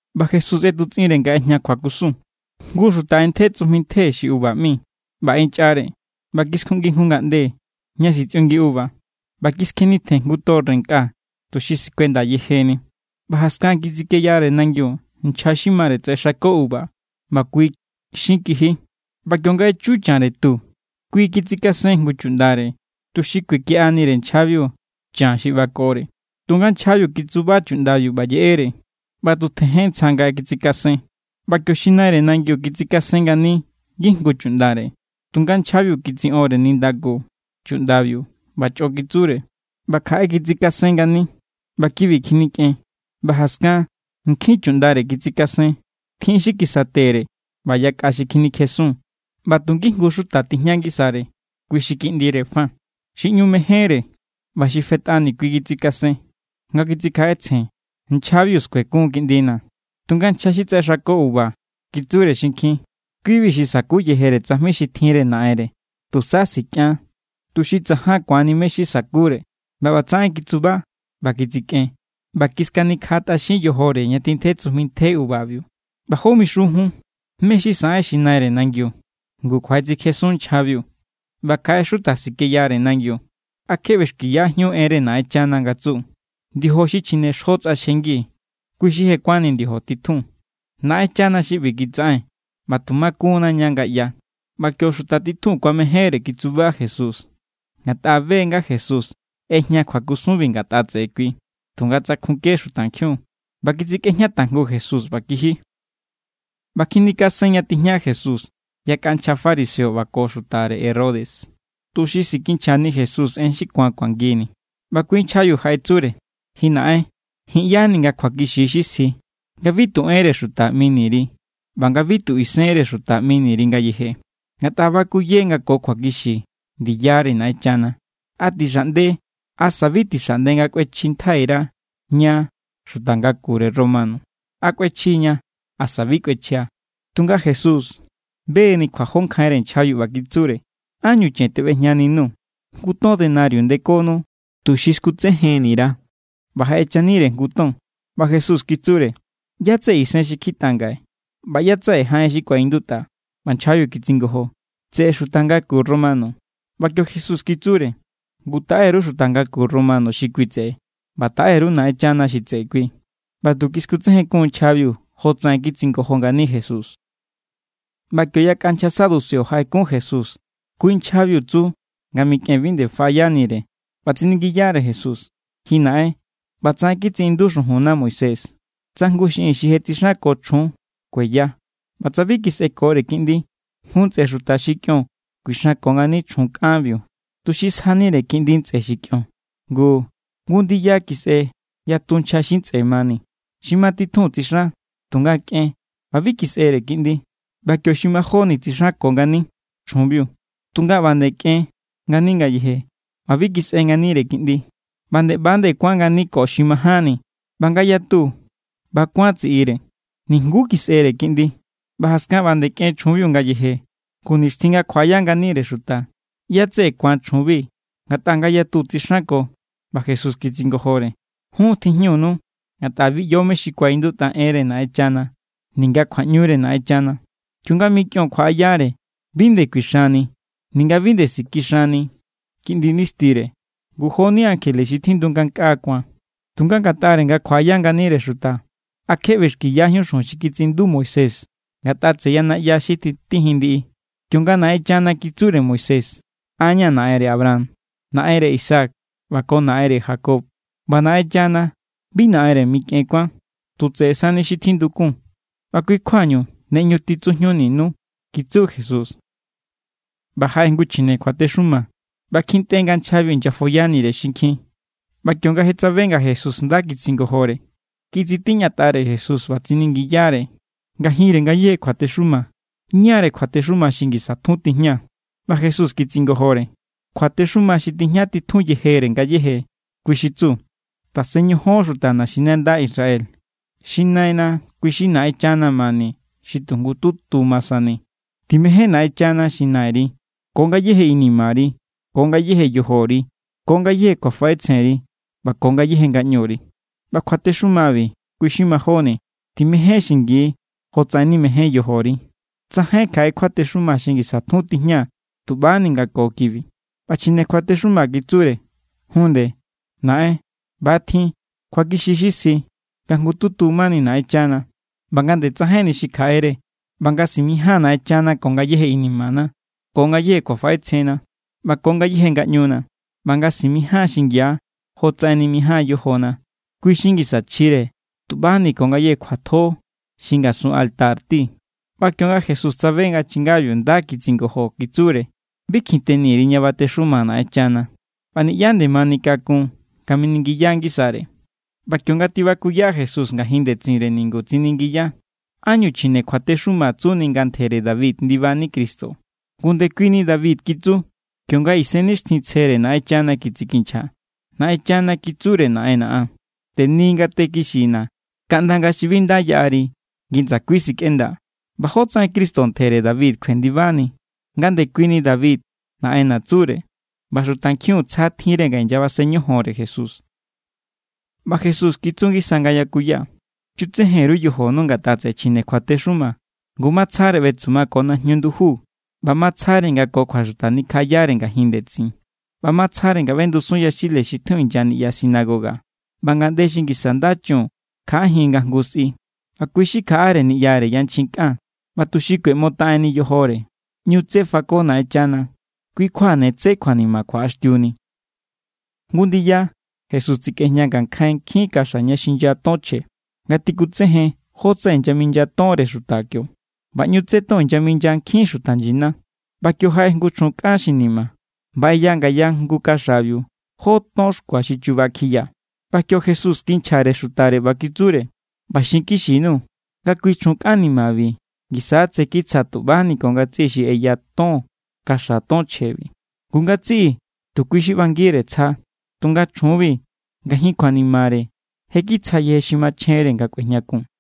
ꞌBa Jesús ꞌetutsꞌinre nga ꞌejña kjuakusun: —Jngu xuta ꞌentje tsujmi ntje xi uva ꞌmi, ꞌba ꞌenchꞌare; ꞌba kiskjuꞌngi jngu ngaꞌnde ña sitsꞌiungi uva, ꞌba kiskjenitjen jngu torre nkꞌa tuxi sikuenda yejeni. ’ꞌBa jaskan kitsikeyare nangiu nchja xi mare tsaꞌexako uva, ꞌba kui xin kiji. ꞌBa kionga echu chanre tu, kui kitsikasen jngu chuꞌndare tuxi kuekiꞌanire nchjabiu chan xi ꞌbakore. Tunga nchjabiu kitsuba chuꞌndabiu ꞌba yeꞌere, ꞌba tu tjejen ntsja nga kitsikasen. ꞌBa kio xi naire nangiu kitsikasen ngani ngijngu chuꞌndare; tunga nchjabiu kitsiꞌonre nindaku chuꞌndabiu, ꞌba chꞌo kitsure. ꞌBa kjaꞌe kitsikasen ngani, ꞌba kibi kjinikꞌen. ꞌBa jaskan nkjin chuꞌndare kitsikasen; tjin xi kisatere ꞌba yakꞌa xi kjinikjesun. ’ꞌBa tu ngijngu xuta tijña ngisare, kui xi kiꞌndire fa, xi ꞌñu mejénre. ꞌBa xi fetꞌani kui kitsikasen, nga kitsikjaꞌetsjen: “Nchjabiu skuekun= kiꞌndina̱.” Tunga nchja xi tsaꞌexako uva kitsure xinkjin: “Kibi= xi sa̱ku yejere tsajmi xi tjinre naꞌenre; tusa sikꞌian, tuxi tsajan ku̱anni mé= xi sakure.” ꞌBa ꞌbatsaꞌen kitsuba, ꞌba kitsikꞌen ꞌba kiskanikjaꞌa tꞌaxin yojore ña tjintje tsujmi ntje uvabiu. ’ꞌBa, ¿jó mixun jun? ¿Mé= xi saꞌen xi naire nangiu? Ngu kjuaꞌetsikjesun nchjabiu, ꞌba kjaꞌe xuta sikeyare nangiu. ’¿A kje ꞌbexkiyajíun enre Naꞌenchana? Nga tsu: Ndiojo xi chjine xjo tsꞌaxjengi, kui= xi je kuánni ndiojo titjun. Naꞌenchana xi ꞌbi kitsaꞌen, ꞌba tu makun=na ña nga ꞌya. ꞌBa kio xuta titjun kuamejénre kitsuba Jesús, ngatꞌa be= nga Jesús ꞌejña kjuakusunbi ngatꞌa tseꞌe kui. Tunga tsakjunke xutankjiun, ꞌba kitsikꞌejña tajngu Jesús ꞌba kiji. ꞌBa kjinikasen ña tijña Jesús yakꞌa nchja fariseo ꞌba ko xutare Herodes, tuxi sikinchjani Jesús en xi ku̱an kuangini. ꞌBa kui nchjabiu jaꞌetsure: —Ji naꞌen, ji̱n ꞌya=ni nga kjuakixi= xi sji nga bi tu enre xuta ꞌmini_ri ꞌba nga bi tu isenre xuta ꞌmini_ri ngayeje, ngatꞌa bakuye nga ko kjuakixi ndiyare Naꞌenchana. ¿A tixaꞌnde asa bi tixaꞌnde nga kꞌuechjintjai_ra ña xuta ngakure Romano? ¿A kꞌuechji=ña, asa bi kꞌuechja? Tunga Jesús be=ni kjuajó nkjainre nchjabiu, ꞌba kitsure: —¿Ánñu chen teꞌbejñaninuu̱? Jngu ton ndenario ndekonu, tuxi skutsejenni_ra̱. ꞌBa jaꞌechanire jngu ton, ꞌba Jesús kitsure: —¿ꞌYá= tseꞌe isen xi kjitꞌa ngaꞌe, ꞌba ꞌyá= tseꞌe jaꞌen xi kuaꞌindutꞌa? ꞌBa nchjabiu kitsingojo: —Tseꞌe xuta ngaku Romano=. ꞌBa kio Jesús kitsure: —Ngu taꞌe_ru xuta ngaku Romano xi kui tseꞌe, ꞌba taꞌe_ru Naꞌenchana xi tseꞌe kui. ꞌBa tu kiskutsejenkun= nchjabiu jotsaꞌen kitsingojo ngani Jesús. ꞌBa kio yakꞌa nchja saduceo jaꞌekun Jesús. Kui= nchjabiu tsu nga mikꞌen bi nde faꞌayanire; ꞌba tsiningiyare Jesús: —Ji naꞌen, ꞌba tsaꞌen kitsiꞌindu xujunna Moisés: “Tsa jngu xiꞌin xi je tsixanko chjun kueya, ꞌba tsa bi kisꞌekore kiꞌndi, jngu ntsꞌe xuta xi kꞌion kuixanko ngani chjun kꞌanbiu tuxi sjanire kiꞌndi ntsꞌe xi kꞌion.” Ngu jngu ndiya kisꞌe yatu nchja xi ntsꞌe mani. Xi ma titjun tsixan, tunga kꞌen ꞌba bi kisꞌere kiꞌndi. ꞌBa kio xi majóni tsixanko ngani chjunbiu, tunga ꞌba nde kꞌen ngani ngayeje ꞌba bi kisꞌe nganire kiꞌndi; ꞌba nde ꞌba=nde kuán ngani ko xi majánni. ꞌBa nga yatu ꞌba= kuán tsiꞌire, nijnguú kisꞌere kiꞌndi. ꞌBa jaskan ꞌba nde kꞌen chjunbiu ngayeje. Ngu, nixtjin nga kjuaꞌaya nganire xuta, ¿ꞌyá= tseꞌe ku̱an chjunbi ngatꞌa ngayatu tsixanko? ꞌBa Jesús kitsingojore: —Jun tjijñunu, ngatꞌa bi ꞌyo mé= xi kuaꞌindutꞌa enre Naꞌenchana ninga kjuaꞌñure Naꞌenchana. Kionga mikꞌion kjuaꞌayare, bi nde kuixanni ninga bi nde sikixanni kiꞌndi nistire, ngu joni ankjele xi tjindu ngankꞌaa ku̱an. Tunga ngatꞌare nga kjuaꞌaya nganire xuta, ¿a kje ꞌbexkiyajíun xujun xi kitsiꞌindu Moisés ngatꞌa tseꞌe ya naꞌya xi tjitijin ndiꞌi? Kionga Naꞌenchana kitsure Moisés: “An= ña̱ naꞌenre Abraham, naꞌenre Isaac ꞌba ko tseꞌe Jacob.” ꞌBa Naꞌenchana bi naꞌenre mikꞌen kuán, tu tseꞌe sani xi tjindukun; ꞌba kui= kjuañu ne ꞌñu titsujñuninu —kitsu Jesús. ꞌBa jaꞌe jngu chjine kjuatexuma, ꞌba kjintꞌe nga nchjabiu inyafoyanire xinkjin, ꞌba kionga je tsabe nga Jesús nda kitsingojore, kitsitiñatꞌare Jesús ꞌba tsiningiyare: —Ngajinre ngayéje kjuatexuma, ¿ñáre̱ kjuatexuma xi ngisa tjun tijña? ꞌBa Jesús kitsingojore: —Kjuatexuma xi tijña titjun yejere ngayéje, kui xi tsu: “Tasen ñojon, xuta naxinanda Israel, xi Naina kui xi Naꞌenchana mani xi tu jngututu ma sani. Timején Naꞌenchana xi Naꞌenri ko ngayéje inimari, ko ngayéje yojori, ko ngayéje kjuafaꞌetsjenri ꞌba ko ngayéje ngaꞌñuri.” ꞌBa kjuatexumabi kui= xi majóni: “Timején xingi jotsaꞌen nimején yojori.” Tsajain kjaꞌe kjuatexuma xi ngisa tjun tijña tuꞌbani nga ko kibi. ꞌBa chjine kjuatexuma kitsure: —Jun nde, naꞌen, ꞌba= tjin. Kjuakixi= xi sji, nga tu jngututu mani Naꞌenchana, ꞌba nga nde tsajainni xi kjaꞌere. ꞌBa nga ña simijían Naꞌenchana ko ngayéje inimana, ko ngayéje kjuafaꞌetsjenna, ꞌba ko ngayéje ngaꞌñuna, ꞌba nga simijían xingia jotsaꞌen nimijáan yojona, kui= xi ngisa chjire tuꞌbani ko ngayéje kjuatjo xi ngasun altar ti. ꞌBa kionga Jesús tsabe nga chingabiu nda kitsingojo, kitsure: —Bi kjin teni_ri ña batexuma Naꞌenchana. ꞌBa niꞌyá nde manikakun nga miningiya ngisare. ꞌBa kionga tibakuya Jesús ngajin ndetsinre ningu, tsiningiya: —¿Ánñu chjine kjuatexuma tsuni nga ntjere David ndibani Cristo? Ngu ndekuini David kitsu, kionga Isennixtjintsjere Naꞌenchana kitsikinchja: Naꞌenchana kitsure Naꞌenna̱ an: “Teni ngate kixina̱, kaꞌnda nga̱ xi bi nda yaꞌari ngi ndsakui sikꞌendaa̱.” ꞌBa ¿jótsaꞌen Cristo ntjere David kjuendibani, nga ndekuini David naꞌenna̱ tsure? ꞌBa xutankjiun tsja tjinre nga inyabasen ñojonre Jesús. ꞌBa Jesús kitsu ngisa nga yakuya: —Chutsejen_ru yojonu ngatꞌa tseꞌe chjine kjuatexuma, ngu matsjare ꞌbetsuma ko najñu nduju ꞌba matsjare nga ko kjuaxuta nikjaꞌayare ngajin ndetsin. ꞌBa matsjare nga ꞌbendusun yaxile xi tjun inya niꞌya sinagoga ꞌba ngaꞌnde xi ngisa nda chun kjaꞌajin nga jngu sꞌi, ꞌba kui xi kjaꞌare niꞌyare yanchjin kꞌan ꞌba, tuxi kꞌueꞌmotaꞌen yojore, ꞌñu tsé fako Naꞌenchana. Kui kjua ne tsé kjuanima kjuaꞌaxtiuni. Jngu ndiya Jesús tsekꞌejña ngankjain nkjin kaxa ña xinya ton chje nga tikutsejen jótsaꞌen inyaminya tonre xuta kio. ꞌBa ꞌñu tsé ton inyaminya nkjin xuta nyina. ꞌBa kio jaꞌe jngu chjun kꞌan xi ni̱ma̱ ꞌba ꞌeya ngaya jngu kaxabiu jó ton xkua xi chuba kjiya. ꞌBa kio Jesús kinchjare xutare ꞌba kitsure: —ꞌBa xinkixi_nuu̱ nga kui chjun kꞌan nimabi ngisa= tsé kitsja tuꞌbani ko ngatsiꞌi xi ꞌeya ton kaxa ton chjebi. Ngu ngatsiꞌi tu kui xi ꞌbangire tsja, tunga chjunbi, ngajin kjuanimare, je kitsja yeje xi machjenre nga kꞌuejñakun.